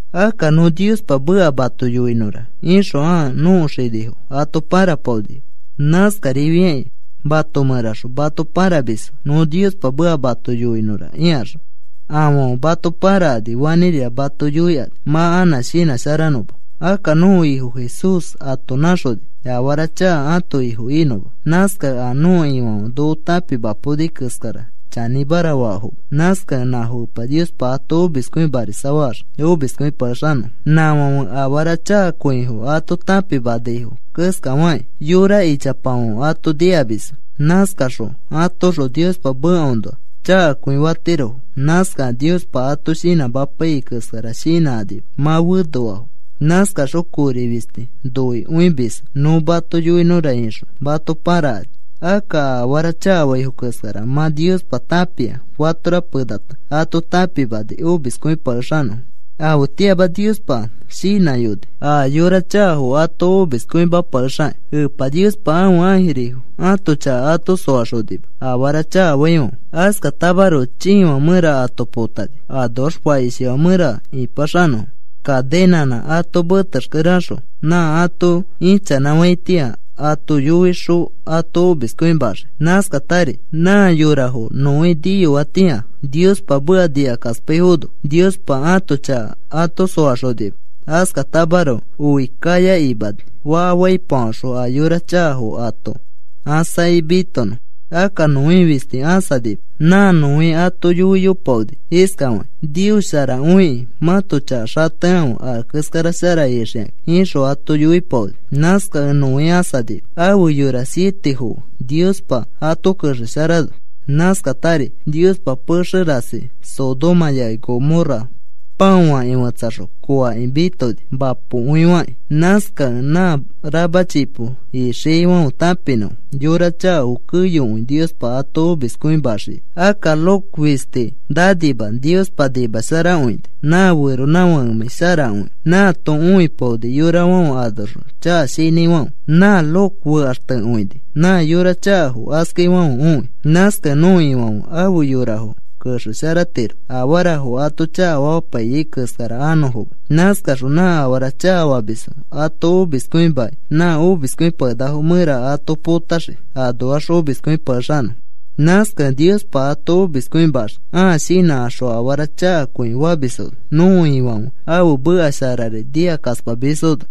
Akka, “Nõ Niospa meka mato yoinõra,” ixõ ãa nõko xinifo ato pãrapaonifo. Nãskarifiakĩ mato mẽraxõ mato pãramisfo, “Nõ Niospa meka mato yoinõra,” ikaxõ. Afãfe mato pãrakani fanĩrira mato yoikani mã anã shinãsharanõma. Akka nõko Ifo Jesús ato nãxoni afara chaka ãto ifo inõma. Nãskakẽ a nõko Ifãfe noko tãpimapaoni keskara chanĩmara faafoma. Nãskakẽ nãfo Epa Niospa ato omiskõimarisafaxii omiskõipakexanõfo. Nãfãfe afara chakakõifo ato tãpimanaifo keskafakĩ yora ichapafãfe ato nikamisfo. Nãskakaxõ atoõxõ Niospa mekaõnoa chakakõi fatirofo. Nãskakẽ a Niospa ato shinãmapaiyai keskara shinãkanima mã fenoafo. Nãskakaxõ kori fisti noikõimisfo, “Nõ mato yoinõra,” ixõ mato pãrakani. Akka a afara chakafaifo keskara mã Niospa tãpia fatora penata ato tãpimani omiskõipakexanõfo. Afetĩama Niospa shinãyoni a yora chakafo ato omiskõimapakexakĩ. Epa Niospa ãfe ãjirifo ãto chaka ato soaxonima afara chakafaifãfe. Askatamaroko chiifã mẽra ato potani, anoax fakishifã mẽra ĩpaxanõfo kaninãnã ato metexkere axõ. Nã ato ichanãfaitĩa ato yoixõ ato omiskõimaxii. Nãskatari nã yorafo Noé niyoatĩa Niospa meka nikakaspaifono Niospa ãto chaka ato soaxonima. Askatamaroko oi kaya imani faka faipafaxõ a yora chakafo ato ãsakĩ mitonõ. Akka Noé fisti ãsanima. Nã Noé ato yoiyopaoni iskafakĩ: “Nios sharakõikĩ mãto chaka xatekãfe a keskara shara ixikakĩ,” ixõ ato yoipaoni. Nãskakẽ Noé ãsanima afe yora sietefo fe Niospa ato kexesharano. Nãskatari Niospa pexe rasi Sodoma yafi Gomorra pãoakĩ fetsaxõ kooakĩ mitoni, mapokõifakĩ. Nãskakẽ nã rama chipo ixiaifãfe tãpinõfo yora chakafo keyokõi Niospa ato omiskõimaxiai. Akka Lot fisti nanima Niospa nimasharakõini. Nã feronãfakemãi sharakõikẽ, nãato õipaoni yorafãfe anoxõ chaka shinãifãfe. Nã Lot fekaxtekõini, nã yora chakafo askaifãfe õi. Nãskakẽ nõko Ifãfe afe yorafo kexesharatiro afarafo ato chakafamapaiyai keskara anõfoma. Nãskaxõ nã afara chakafamisfo ato omiskõimakĩ nã omiskõipakenakafo mẽra ato potaxii anoax omiskõipakexanõfo. Nãskakẽ Niospa ato omiskõimaxii ãa shinãkaxõ afara chakakõi famisfono, nõko Ifãfe ãfe meka sharari nikakaspamisfono.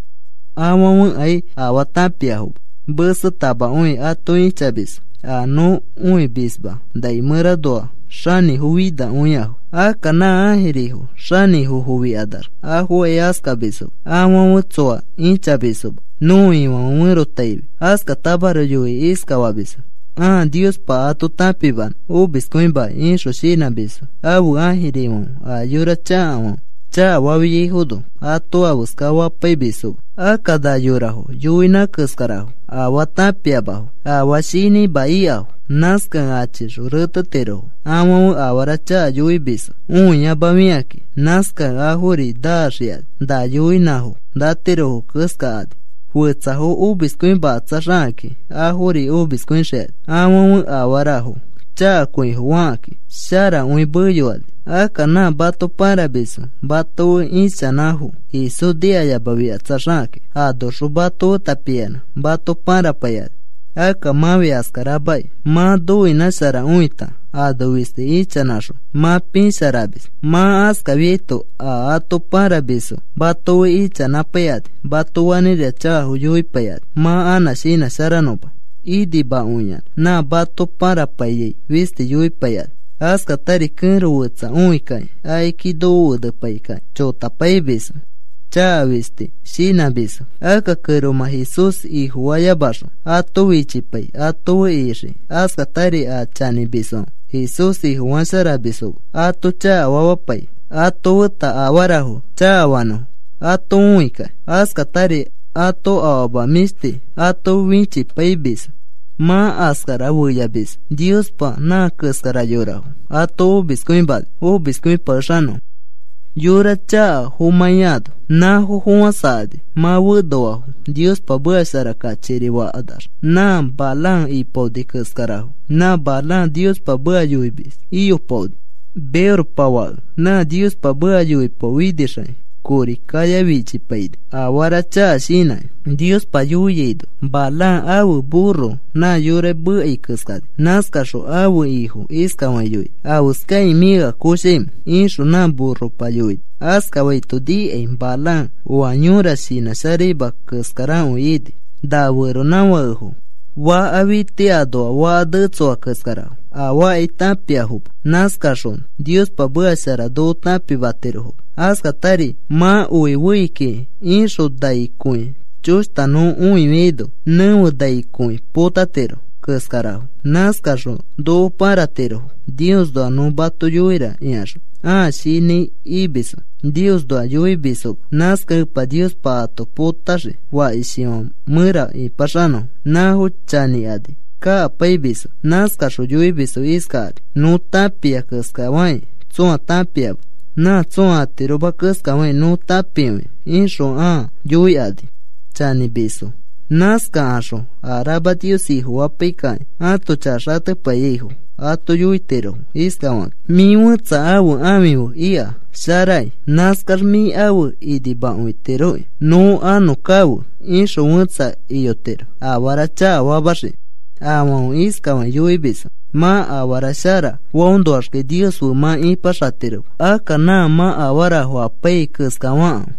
Afãfekai afaa tãpiafoma. Mesetamakõi ato ĩchamisfo a nõ õimisma nai mẽranoa xanĩfo finakõiafo. Akka nã ãjirifo xanĩfofikanax afokai askamisfoma. Afãfe tsoa ĩchamisfoma nõko Ifãfe ferotaifi. Askatamaroko yoikĩ iskafamisfo: “Ãa Niospa ato tãpimanõ omiskõimakĩ,” ixõ shinãmisfo ãfe ãjirifãfe a yora chakafãfe chakafafiaifono ato afeska fapaimisfoma. Akka na yorafo yoinã keskarafo, afaa tãpiafoma. Afaa shinãima ikafo. Nãskakẽ achixõ retetirofo. Afãfe afara chaka yoimisfo õiyamafikakĩ, nãskakẽ afori naxikani na yoinãfo natirofo keskakani. Fetsafo omiskõimakatsaxakakĩ afori omiskõixikani. Afãfe afarafo chakakõifo fakakĩ sharakõimeyokani. Akka nã mato pãramisfo mato fe ichanãfo Jesús nikayamafikatsaxakakĩ. Anoxõ mato feta piyanã mato pãrapaikani. Akka mãfi askaramakĩ mã noinãsharakõita ano fisti ichanãxõ mã piisharamis. Mã askafiaito a ato pãramisfo mato fe ichanãpaikani mato fanĩrira chakafo yoipaikani mã anã shinãsharanõma. Inimakõiyanã nã mato pãrapaiyai fisti yoipaikani. Askatari kẽro fetsa õikakĩ akiki nokofenepaikakĩ chotapaimisfo, chaka fisti shinãmisfo. Akka kẽromã Jesús Ifofayamaxõ ato fichipai ato fe ixiki. Askatari a chanĩmisfãfe Jesús Ifofasharamisfoma ato chakafamapai ato feta afarafo chakafanõfo ato õikakĩ. Askatari ato afama mĩshti ato fichipaimisfo mã askara feyafamisfo. Niospa nã keskara yorafo ato omiskõimani omiskõipakexanõfo, yora chakafomãiano. Nãfo fofãsakani mã fenoafo, Niospa meka shara kachikiri fakanax nã Balaam ipaoni keskarafo. Nã Balaam Niospa meka yoimis iyopaoni, Beorpa fake. Mã Niospa meka yoipaofinixakĩ kori kaya fichipaini, afara chaka shinãkĩ. Niospa yoiaino Balaam ãfe burro nã yora mekai keskani. Nãskaxõ ãfe ifo iskafakĩ yoini: “¿Afeskakĩ mĩ ea koshaimẽ?” ixõ nã burropa yoini. Askafaito nikai Balaam oa yõra shinãsharaima keskarakõi ini. Na feronãfakefo faka fiti anoa faka netsoa keskarafo. Afaakai tãpiafoma, nãskaxõ Niospa meka shara noko tãpimatirofoma. Askatari mã oi fei kiki ixõ, nai kõi choshta nõ õifiaino, nẽfe nai kõi potatiro keskarafo. Nãskarakaxõ noko pãratirofo: “Niosnoa nõ mato yoira,” ikaxõ ãa shinãi imisfo Niosnoa yoikõimisfoma. Nãskakẽ Epa Niospa ato potaxii fakishifã mẽra ipaxanõfo. Nãfo chanĩkani kakapaimisfo. Nãskaxõ yoimisfo iskakani: “Nõ tãpia keskafakĩ tsõa tãpiama. Nã tsõa atiroma keskafakĩ nõ tãpikõia,” ixõ ãa yoikani chanĩfinamisfo. Nãskakaxõ a rama Nios Ifofapaikakĩ ãto chaka xatepaiyaifo ato yoitirofo iskafakakĩ: “Mĩ fẽtsa ãfe ãfi fe ika sharakĩ, nãskax mĩ afe inimakõitiroki, nõ anõ kafe,” ixõ fẽtsa iyotiro afara chakafamaxiki. Afãfe iskafakĩ yoimisfo: “Mã afara shara faõnoaxkai Nios fe mã ĩpaxatiroma. Akka nã mã afarafo apaiyai keskafakãfe.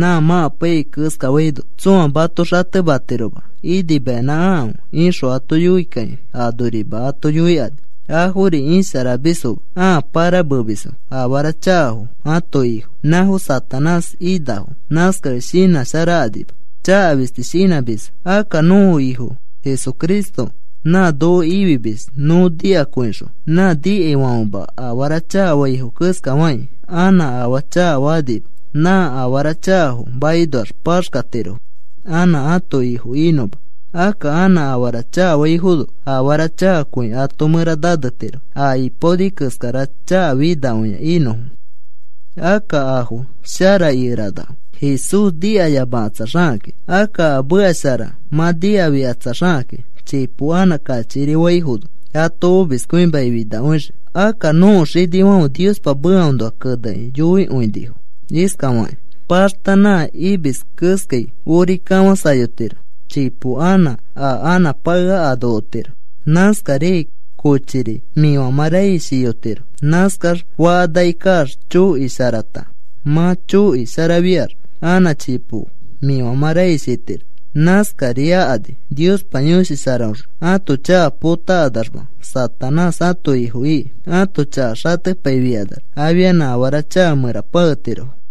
Nã mã apaiyai keskafaino tsõa mato xatematiroma inimayanã akãfe,” ixõ ato yoikakĩ anorima ato yoikani. Afori isharamisfoma, ãa pãramemisfo. Afara chakafo ãto ifo, nãfo Satanás inafo. Nãskakẽ shinãsharakanima. Chaka fisti shinãmisfo. Akka nõko Ifo Jesucristo nã noko ifimis, nõ nikakõixõ nã nikaifãfema afara chakafaifo keskafakĩ, anã afaa chakafakanima. Nã afara chakafo makinoax paxkatirofo anã ãto ifo inõma. Akka anã afara chakafaifono afara chakakõi ato mẽra nanetiro a ipaonifo keskara chakafinakõia inõfo. Akka afo shara ikeranafo Jesús nikayamakatsaxakakĩ. Akka a meka shara mã nikafikatsaxakakĩ chipo anã kachikiri faifono ato omiskõimaki finakõixii. Akka nõko xinifãfe Niospa mekaõnoa kenekĩ yoikõinifo iskafakĩ: “Paxta nã imis keskai ori kafãsayotiro. Chipo anã a anãpakea ano otiro. Nãskariai kochiri mĩfamã raish iyotiro, nãskax fakanaki kaax choki sharata, mã choki sharafiax anã chipo mĩfamã raish itiro.” Nãskari akani Niospa Yõshi Sharaõxõ ãto chaka potakanamax Satanás ãto ifo iki. Ãto chaka xatepaifikanax afianã afara chaka mẽra paketirofo.